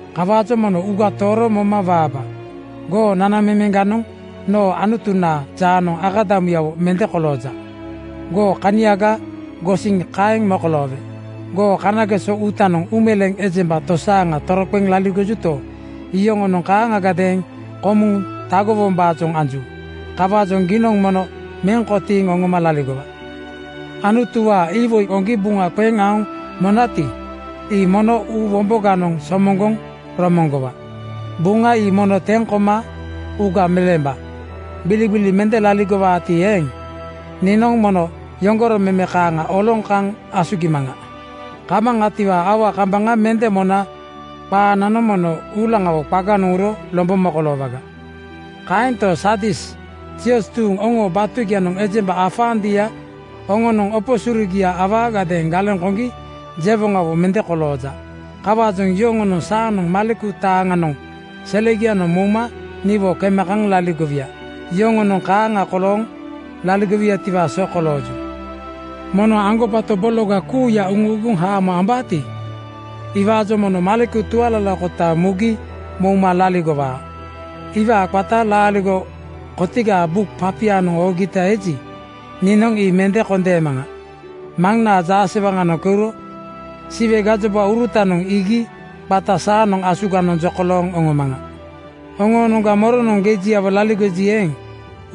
Kawaajoŋ mono uuga tooro moma waaba. Goo nanamemeŋganoŋ noo Anutunaa jaanoŋ akadamuyawo mende kolooja. Goo kaniaga gosiŋ kaeŋ mokoloowe. Goo kanageso uutanoŋ uumeleeŋ ejemba tosaaŋa toroqeŋ laligojuto, iyoŋonoŋ kaaŋagadeeŋ komuŋ tagowombaajoŋ anju. Kawaajoŋ giinoŋ mono meŋ kotiiŋ oŋoma laligowa. “Anutuwaa iwoi goŋgi buŋa qeŋ aoŋ monati, ii mono uu womboganoŋ somoŋgoŋ romoŋgowa. Buŋa ii mono teŋ koma uuga meleemba. Gbiligbili mende laligowaati eeŋ, niinoŋ mono yoŋgoro meme kaaŋa oloŋ kaŋ asugimaŋa. Kamaŋatiwaa aua kambaŋa mende mona qaananoŋ mono uulaŋawo qaganoŋ uro lombo mokoloowaga. Kaento, Sardis zioz tuuŋ oŋoo batugianoŋ ejemba afaandia oŋonoŋ opo surugia awaagadeeŋ galeŋ koŋgi jewoŋawo mende kolooja. Kawaajoŋ yoŋonoŋ saanoŋ maleku taaŋanoŋ selegianoŋ mouma niwo kema kaŋ laligowuya. Yoŋonoŋ kaaŋa kolooŋ laligowutiwaa so kolooju. “Moŋnoŋ aŋgobato bologa kuuya uuguŋ haamo ambaati, iwaajoŋ mono maleku tualalakota mugi mouma laligowaa. Iwaa qata laaligo kotigaa buk papianoŋ oogita eji, niinoŋ ii mende kondeemaŋa. Maŋnaa jaasewaŋanoŋ keuro Siwe gajobaurutanoŋ iigi qata saanoŋ asuganoŋ jokolooŋ oŋomaŋa. “Oŋoonoŋga moronoŋ gejiawo laligoji eeŋ,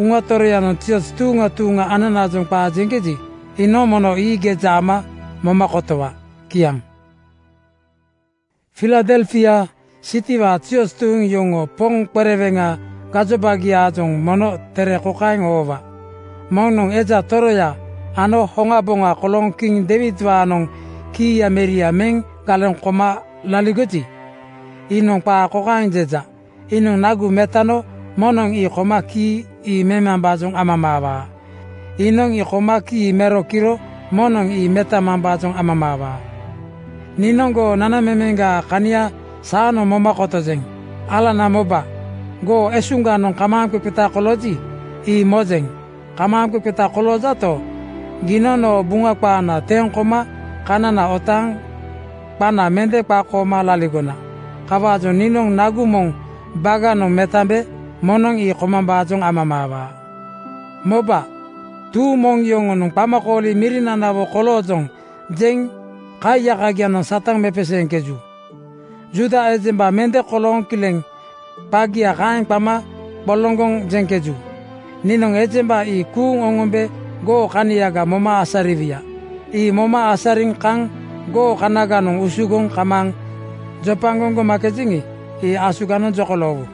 Uŋa Toroyanoŋ zioz tuuŋa tuuŋa ananaajoŋ qaa jeŋkeji, iinoŋ mono ii geja ama moma kotowa.” Kiaŋ. “Filadelfia sitiwaa zioz tuuŋ yoŋoo poŋ qereweŋa gajobagiaajoŋ mono tere kokaeŋ oowa, “Moŋnoŋ Eja Toroya ano Hoŋaboŋa kolooŋ kiŋ Deiwidwaanoŋ kiiya meria meŋ galeŋ koma laligoji, iinoŋ qaa kokaeŋ jeja: Iinoŋ nagu metano moŋnoŋ ii koma kii ii memambaajoŋ amamaawaa. Iinoŋ ii koma kii mero kiro moŋnoŋ ii metamambaajoŋ amamaawaa. Niinoŋ goo nanamemeŋgaa kania saanoŋ moma kotojeŋ. Alana moba, goo esuŋganoŋ kamaaŋqeqeta kolooji, ii mojeŋ. Kamaaŋqeqeta koloojato, giinoŋ noo Buŋa qaana teŋ koma kanana otaaŋ qana mende qakooma laligona. Kawaajoŋ niinoŋ nagu moŋ baganoŋ metambe moŋnoŋ ii komambaajoŋ amamaawaa. “Moba, tuuŋ moŋ yoŋonoŋ ‘Qamakooli mirinanawo koloojoŋ,’ jeŋ kaiyakagianoŋ Satan mepeseeŋkeju. Juuda ejemba mende kolooŋ kileŋ qagia kaeŋ qama qoloŋgoŋ jeŋkeju. Niinoŋ ejemba ii kuuŋ oŋombe goo kaniaga moma asariwuya. Ii moma asariŋ kaŋ goo kanaganoŋ usugoŋ kamaaŋ jopagoŋ gomakejeŋi, ii asuganoŋ jokoloowu.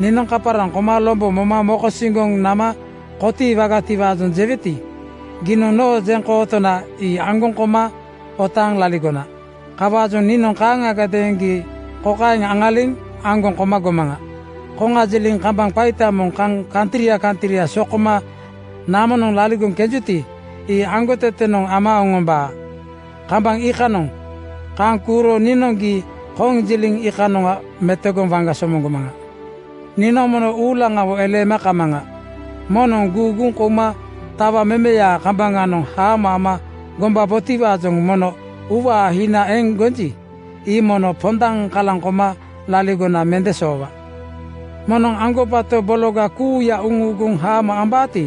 Niinoŋ kaparaŋ koma lombo moma mokosiŋgoŋ nama kotiiwagatiwaajoŋ jeweti, giinoŋ noo jeŋkootona ii aŋgoŋ koma otaaŋ laligona. Kawaajoŋ niinoŋ kaaŋagadeeŋ gii kokaeŋ aŋaliŋ aŋgoŋ koma gomaŋa: Konjiliŋ kambaŋ qaita moŋ kaŋ kantria kantria sokoma namonoŋ laligoŋ kenjuti, ii aŋgotetenoŋ ama oŋombaa. Kambaŋ iikanoŋ kaŋ kuuro niinoŋ gii konjiliŋ iikanoŋa metogoŋ waŋga somoŋgomaŋa. “Niinoŋ mono uulaŋawo eleema kamaŋa. Moŋnoŋ guuguŋ kouma tawa memeyaa kambaŋanoŋ haamo ama gombabotiwaajoŋ mono uuwaa hina eŋ gonji, ii mono pondaŋ kalaŋ koma laligona mende soowa. Moŋnoŋ aŋgobato bologa kuuya uuguŋ haamo ambaati,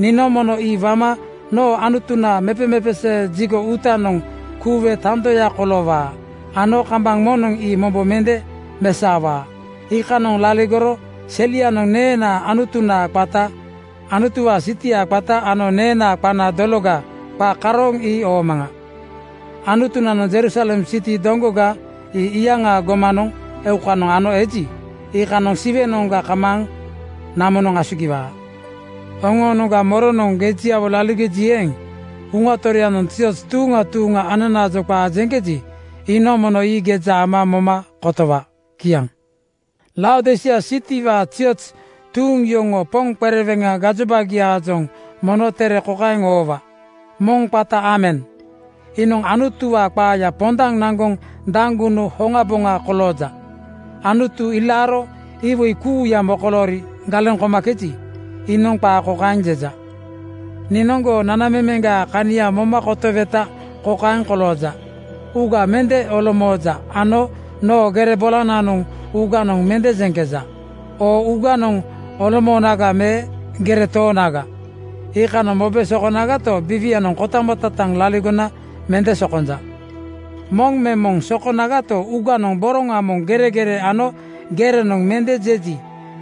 niinoŋ mono ii wama noo Anutunaa mepemepesee jigo (tempel) uutanoŋ kuuwe tandoya koloowaa ano kambaŋ moŋnoŋ ii mombo mende mesaowaa. Iikanoŋ laligoro selianoŋ neenaa Anutunaa qata, Anutuwaa sitiaa qata ano neenaa qana dologa qa karooŋ ii oomaŋa. Anutunanoŋ Jerusalem sitia doŋgoga ii iyaŋaa gomanoŋ eukanoŋ ano eji, iikanoŋ Siwenoŋga kamaaŋ namonoŋ asugiwaa. “Oŋoonoŋga moronoŋ gejiawo laligoji eeŋ, Uŋa Toroyanoŋ zioz tuuŋa tuuŋa ananaajoŋ qaa jeŋkeji, iinoŋ mono ii geja ama moma kotowa.” Kiaŋ. “Laodisia sitiwaa zioz tuuŋ yoŋoo poŋ qereweŋa gajobagiaajoŋ mono tere kokaeŋ oowa, “Moŋ qata Aamen, iinoŋ Anutuwaa qaaya pondaŋ naŋgoŋ Daŋgunu hoŋaboŋa kolooja. Anutu ilaaro iwoi kuuya mokoloori galeŋ komakeji, iinoŋ qaa kokaeŋ jeja: Niinoŋ goo nanamemeŋgaa kania moma kotoweta kokaeŋ kolooja: Uuga mende olomooja ano noo gere bolananoŋ uuganoŋ mende jeŋkeja. Oo uuganoŋ olomoonaga me gere toonaga, iikanoŋ mobe sokonagato, biiwianoŋ kotamototaŋ laligona mende sokonja. “Moŋ me moŋ sokonagato, uuganoŋ boroŋa moŋ geregere ano gereganoŋ mende jeji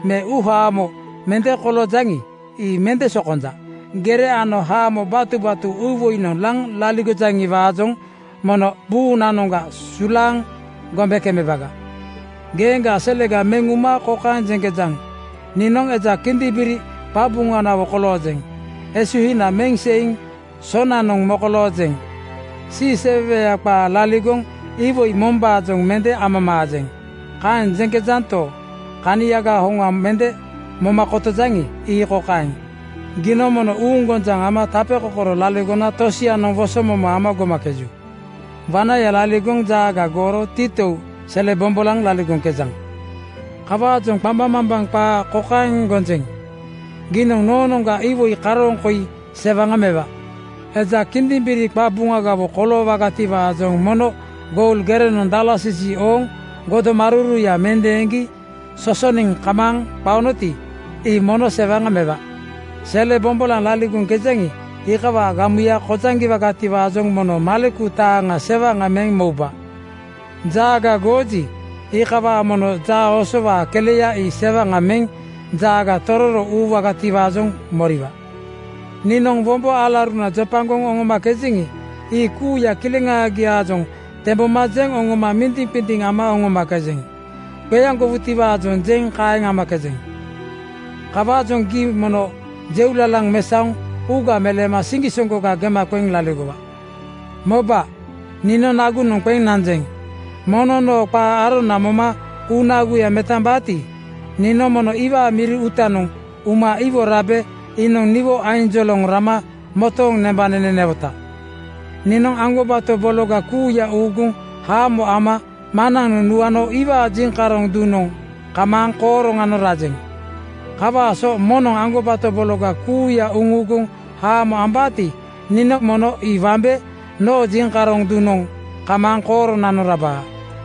me uuhamo mende koloojaŋi, ii mende sokonja. Gere ano hamo batubatu uuwoinoŋ laŋ laligojaŋiwaajoŋ mono buunanoŋga sulaaŋ gombe kemebaga. Geeŋgaa selega meŋ uma kokaeŋ jeŋkejaŋ: Niinoŋ eja kindimbiri qabuŋanawo koloojeŋ. Esuhina meŋ seiŋ sonanoŋ mokoloojeŋ. Siiseweweya qaa laligoŋ iwoi mombaajoŋ mende amamaajeŋ. Kaeŋ jeŋkejanto, kaniaga hoŋa mende moma kotojaŋi, ii kokaeŋ: Giinoŋ mono uuŋgonjaŋ ama tapekokoro laligona tosianoŋ wosomomo ama gomakeju. Wanaya laligoŋ jaaga gooro titou sele bombolaŋ laligoŋkejaŋ. “Kawaajoŋ qambaŋmambaŋ qaa kokaeŋ gonjeŋ: Giinoŋ noonoŋga iwoi karooŋ koi sewaŋa mewa: Eja kindimbiri qabuŋagawo koloowagatiwaajoŋ mono goul gerenoŋ dalasisi ooŋ godomaruruya mendeeŋgi sosoniŋ kamaaŋ qaonoti, ii mono sewaŋa mewa. Sele bombolaŋ laligoŋkejaŋi, iikawaa gamuya kojaŋgiwagatiwaajoŋ mono maleku taaŋa sewaŋa meŋ mouba. Jaaga gooji, iikawaajoŋ mono jaaosowaa keleya ii sewaŋa meŋ jaaga tororo uuwagatiwaajoŋ moriwa. Niinoŋ wombo alauruna jopagoŋ oŋomakejeŋi, ii kuuya kileŋagiaajoŋ temboma jeŋ oŋoma mindiŋqindiŋ ama oŋomakejeŋ. Qeaŋgowutiwaajoŋ kaeŋ amakejeŋ. Kawaajoŋ gii mono jeulalaŋ mesaoŋ uuga meleema siŋgisoŋgoga gema qeŋ laligowa. “Moba, niinoŋ nagunoŋ qeŋ nanjeŋ. Moŋnoŋ noo qaa arona moma uu naguya metambaati, niinoŋ mono iwaa miri uutanoŋ uma iwo rabe iinoŋ niwo ainjoloŋ rama motooŋ nembanene newota. “Niinoŋ aŋgobato bologa kuuya uuguŋ haamo ama Maŋnanoŋ nuano iwaa jiŋkaroŋ duŋanoŋ kamaaŋ kooroŋanoŋ rajeŋ. Kawaa so moŋnoŋ aŋgobato bologa kuuya uuguŋ haamo ambaati, niinoŋ mono ii wambe noo jiŋkaroŋ duŋnanoŋ kamaaŋ kooronanoŋ rabaa.